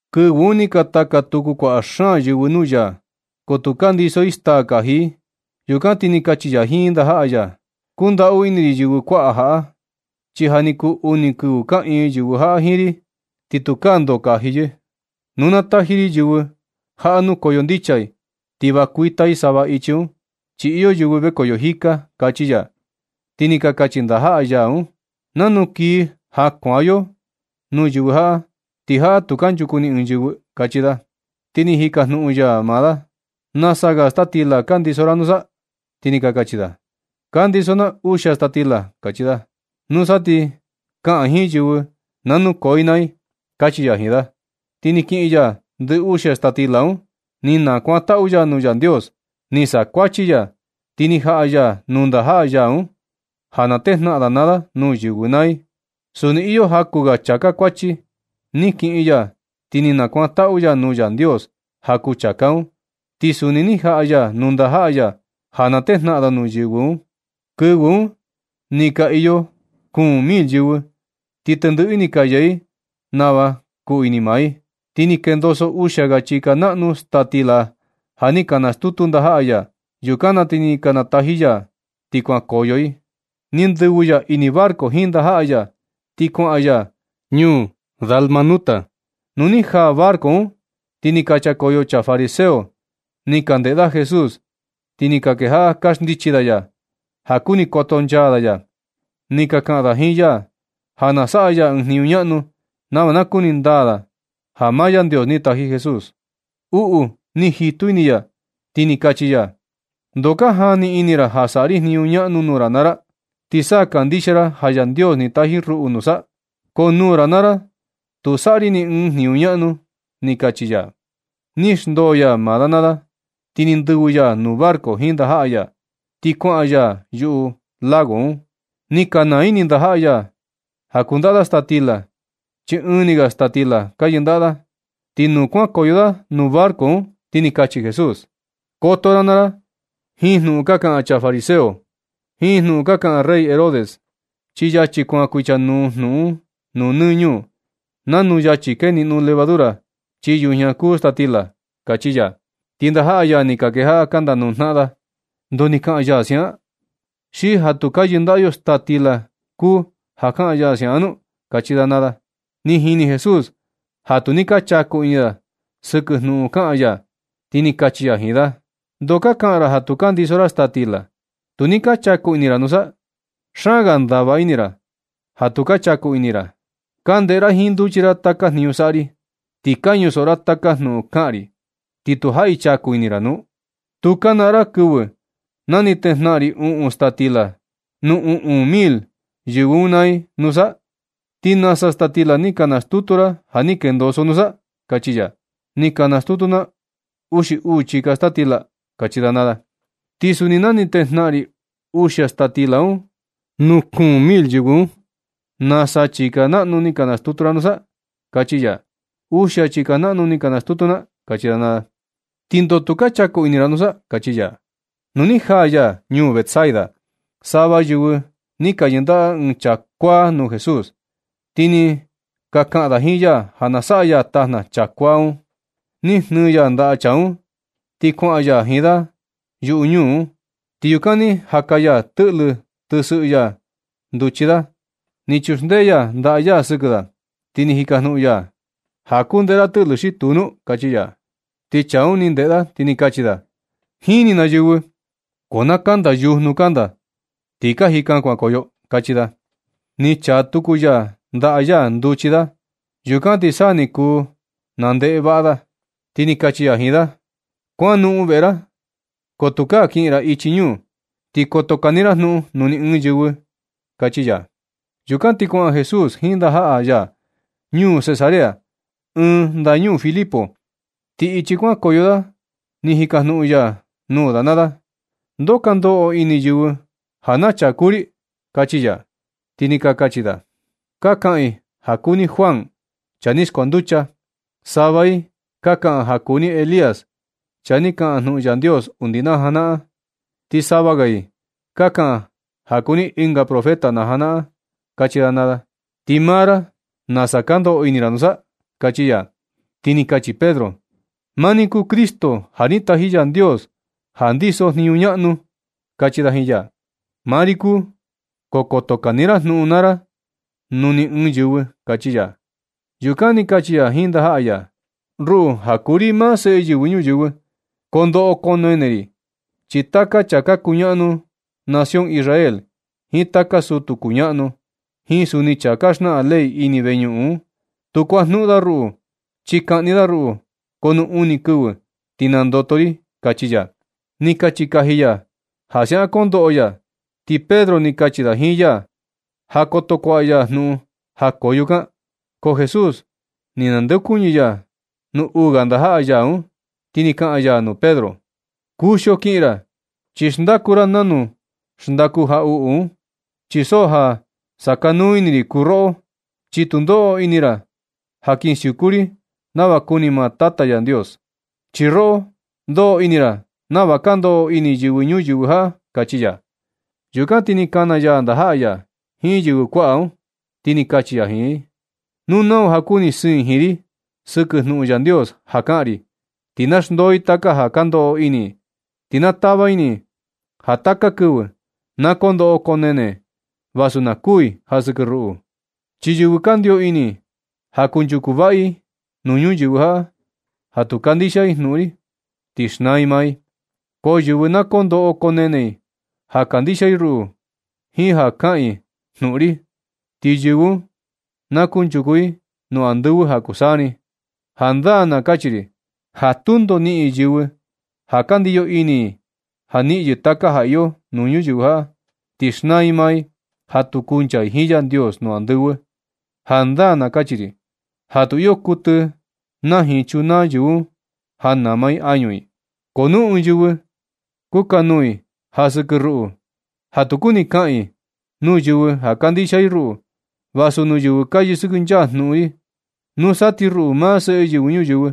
Kɨvɨ un ni ka taka tuku kuaꞌa xaan yɨvɨ nuu ya, ko tu ka ndiso i staa kaji i. Yukan ti ni kachi ya jiin ndajaꞌa ya: ―Kundaꞌu ini ri yɨvɨ kuaꞌa jaꞌa, chi ja ni kuu uni kɨvɨ kaꞌiin yɨvɨ jaꞌa jiin ri, ti tukaa ndoo kaji yɨ. Nu na nataji ri yɨvɨ jaꞌa nukoyo ndicha i, ti va kuita i sava ichi un, chi iyo yɨvɨ vekoyo jika ―kachi ya. Ti ni ka kachi ndajaꞌa ya un: ―¿Nanu kii ja kuaꞌa yo nuu yɨvɨ jaꞌa, ti jaꞌa tu kanchuku ni ɨɨn yɨvɨ? ―kachi da. Ti ni jikajnuꞌun ya da: ―¿Nasa ga staa stila kandiso ra nusa? Ti ni ka kachi da: ―Kandiso na uxia staa stila ―kachi da. Nusa, ti kaꞌan jiin yɨvɨ na nukoo i naa i ―kachi ya jiin da. Ti ni kiꞌin ya ndɨ uxia staa stila un, ni nakuantaꞌu ya nuu Yandios, ni sakuachi ya, ti ni jaꞌa ya nuu ndajaꞌa ya un, ja na tejnaꞌan da naa da nuu yɨvɨ naa i. Suni iyo jaku ga chāká kuachi. Ni kiꞌin ya ti ni nakuantaꞌu ya nuu Yandios ja kuu chāká un. Ti suni ni jaꞌa ya nuu ndajaꞌa ya ja na tejnaꞌan da nuu yɨvɨ un. Kɨvɨ un ni ka iyo kuun mil yɨvɨ, ti tendɨꞌɨ i ni ka yee i nava kuu ini maa i. Ti ni kendoso uxia ga chika naꞌnu staa stila ja ni ka nastutu ndajaꞌa ya. Yukan na ti ni nataji ya, ti kuan nukoyo i. Ni ndɨvɨ ya ini barco jiin ndajaꞌa ya, ti kuaꞌan ya ichi ñuu Dalmanuta. Nu ni jaa barco un, ti ni ka chakoyo chaa fariseo ni ka jandeꞌe da Jesús, ti ni ka kejaꞌa ka xndichi da ya, ja kuni kotonchaa da ya. Ni ka kaꞌan da jiin ya ja na saꞌa ya ɨɨn jniñu ñaꞌnu, nava na kuni ndaa da ja maa Yandios ni taji Jesús. Uꞌu ni jitu ini ya, ti ni kachi ya: ―¿Ndoo ka jani ini ra ja saꞌa ri jniñu ñaꞌnu nuu ra naa ra, ti sa kandixia ra ja Yandios ni taji ruꞌu nusa? Ko nuu ra naa ra tu saꞌa ri ni ɨɨn jniñu ñaꞌnu ―ni kachi ya. Ni xndoo ya da naa da, ti ni ndɨvɨ ya nuu barco jiin ndajaꞌa ya. Ti kuaꞌan ya ɨnga yuꞌu lago un. Ni ka naa ini ndajaꞌa ya ja kundaꞌa da staa stila, chi ɨɨn ni ga staa stila ka yɨndaꞌa da. Ti nu kuankoyo da nuu barco un, ti ni kachi Jesús: ―Koto ra naa ra jiin jnuꞌun ka kaꞌan chaa fariseo jiin jnuꞌun kaꞌan rey Herodes, chi yachi kuan kuichanuu jnuꞌun un nuu nɨ ñuu, nanu yachi keniꞌno levadura chii yujña kuu staa stila ―kachi ya. Ti ndajaꞌa ya ni ka kejaꞌa ka ndajnuꞌun da naa da ndoo ni kaꞌan ya siaꞌan: ―¿Xi ja tu ka yɨndaꞌa yo staa stila kuu ja kaꞌan ya siaꞌan nu? ―kachi da. Ni jini Jesús ja tu ni ka chaku ini da sɨkɨ jnuꞌun kaꞌan ya, ti ni kachi ya jiin da: ―¿Ndoo ka kaꞌan ra ja tu ka ndiso ra staa stila? Tu ni ka chaku ini ra nusa. Xaan ga ndava ini ra ja tu ka chaku ini ra. ¿Ka ndeꞌe ra jiin nduchi ra taka jniñu saꞌa ri, ti ka ñusoꞌo ra taka jnuꞌun kaꞌan ri, ti tu jaꞌi chaku ini ra nu? ¿Tu ka naꞌan ra kɨvɨ na ni tejnaꞌan ri uꞌun staa stila nuu uꞌun mil yɨvɨ un naa i nusa? ¿Ti nasa staa stila ni ka nastutu ra ja ni kendoso nusa? ―kachi ya. ―Ni ka nastutu na uxi uu chika staa stila ―kachi da naa da. ―Ti suni na ni tejnaꞌan ri uxia staa stila nuu kuun mil yɨvɨ un, ¿nasa chika naꞌnu ni ka nastutu ra un nusa? ―kachi ya. ―Uxia chika naꞌnu ni ka nastutu na ―kachi da naa da. ―¿Ti ndoo tu ka chaku ini ra nusa? ―kachi ya. Nu ni jaa ya ñuu Betsaida, sava yɨvɨ ni ka yɨndaꞌa ɨɨn chaa kuáá nuu Jesús. Ti ni ka kaꞌan da jiin ya ja na saꞌa ya tajna chaa kuáá un. Ni jnɨɨ ya ndaꞌa chaa un, ti kuaꞌan ya jiin da yuꞌu ñuu un. Ti yukan ni jaka ya tɨꞌlɨ tɨsɨꞌɨ ya nduchi da. Ni chuxndee ya ndaꞌa ya sɨkɨ da, ti ni jikajnuꞌun ya da: ―¿Ja kuu ndeꞌe ra tɨꞌlɨ, xi tuu nu? ―kachi ya. Ti chaa un ni ndeꞌe da, ti ni kachi da: ―Jini na yɨvɨ, ko na kanda yujnu kanda ti ka jika kuankoyo ―kachi da. Ni chaa tuku ya ndaꞌa ya nduchi da, yukan ti sa ti ni kuu nandeꞌe vaꞌa da. Ti ni kachi ya jiin da: ―Kuanoꞌon veꞌe ra, ko tukaa kiꞌin ra ichi ñuu. Ti koto kani ra jnuꞌun nuu ni ɨɨn yɨvɨ un ―kachi ya. Yukan ti kuaꞌan Jesús jiin ndajaꞌa ya ñuu Cesarea, ɨɨn ndañuu Filipo. Ti ichi kuankoyo da ni jikajnuꞌun ya nuu da naa da: ―¿Ndoo ka ndoꞌo ini yɨvɨ ja naa chaa kuu ri? ―kachi ya. Ti ni ka kachi da: ―Ka kaꞌan i ja kuu ni Juan, chaa ni skuanducha. Sava i ka kaꞌan ja kuu ni Elías, chaa ni kaꞌan jnuꞌun Yandios undi na janaꞌan. Ti sava ga i ka kaꞌan ja kuu ni ɨnga profeta na janaꞌan―kachi da naa da. ―Ti maa ra, ¿nasa ka ndoꞌo ini ra nusa? ―kachi ya. Ti ni kachi Pedro: ―Maa ni kuu Cristo, ja ni taji Yandios ja ndiso jniñu ñaꞌnu ―kachi da jiin ya. ―Maa ri kuu, ko koto kani ra jnuꞌun naa ra nuu ni ɨɨn yɨvɨ ―kachi ya. Yukan ni kachi ya jiin ndajaꞌa ya: ―Ruꞌu ja kuu ri maa Seꞌe Yɨvɨ Ñuyɨvɨ, koo ndoꞌo koo nene ri. Chi taka chaa ka kuñaꞌanu nación Israel, jiin taka sutu kuñaꞌnu, jiin suni chaa ka xnaꞌan ley ini veñuꞌun un, tu kuajnuꞌun da ruꞌu. Chi kaꞌni da ruꞌu, ko nu uni kɨvɨ ti nandoto ri ―kachi ya. Ni kachi kaji ya ja siaꞌan kondoꞌo ya. Ti Pedro ni kachi da jiin ya ja koto kuaꞌa ya jnuꞌun ja koo yukan. Ko Jesús ni nandeokuñɨ ya nuu uu ga ndajaꞌa ya un, ti ni kaꞌan ya nuu Pedro: ―Kuxio kiꞌin ra, chi xndaku ra nanu xndaku jaꞌuꞌu. Chi so ja sakanuu ini ri kuu roꞌo, chi tu ndoꞌo ini ra ja kin siuku ri nava kuni maa Yandios, chi roꞌo ndoꞌo ini ra nava ka ndoꞌo ini yɨvɨ ñuyɨvɨ jaꞌa ―kachi ya. Yukan ti ni kana ya ndajaꞌa ya jiin yɨvɨ kuaꞌa un, ti ni kachi ya jiin i: ―Nu nau ja kuni siin jiin ri sɨkɨ jnuꞌun Yandios ja kaꞌan ri, ti na xndoo i taka ja ndoꞌo ini i, ti na tava ini i ja taka kɨvɨ na koo ndoꞌo koo nene vasu na kuu i ja sɨkɨ ruꞌu. Chi yɨvɨ kandio ini ja kunchuku vaꞌa i nuu ñuyɨvɨ jaꞌa, ja tu kandixia i jnuꞌun ri, ti xnaa i maa i. Ko yɨvɨ na kondoꞌo koo nene i ja na kandixia i ruꞌu jiin ja kaꞌan i jnuꞌun ri, ti yɨvɨ un na kunchuku i nuu andɨvɨ ja kuu saa ni. Jandaa na kachi ri ja tundo niꞌin yɨvɨ ja ka ndiyo ini i niꞌin yɨ taka ja iyo nuu ñuyɨvɨ jaꞌa, ti xnaa i maa i, ja tu kuncha i jiin Yandios nuu andɨvɨ. Jandaa na nachi ri ja tu iyo kuɨtɨ naa jiin chunaa yɨvɨ un ja nama i añu i. Ko nu ɨɨn yɨvɨ kukanuu i ja sɨkɨ ruꞌu, ja tu kuni kaꞌan i nuu yɨvɨ ja kandixia i ruꞌu, vasu nuu yɨvɨ ka yɨsɨkɨnchaa jnuꞌun ri, nusa ti ruꞌu, maa Seꞌe Yɨvɨ Ñuyɨvɨ,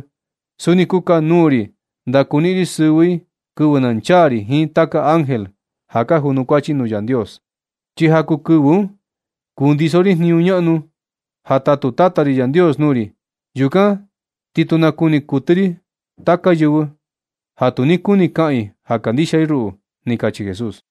suni kukanuu ri ndakuniꞌin ri sɨvɨ i kɨvɨ na nchaa ri jiin taka ángel ja ka junukuachi nuu Yandios. Chi ja kuu kɨvɨ un kundiso ri jniñu ñaꞌnu ja tatu Tata ri Yandios nuu ri naa ri. Yukan ti tu nakuni kuɨtɨ ri taka yɨvɨ ja tu ni kuni kaꞌan i ja kandixia i ruꞌu ―ni kachi Jesús.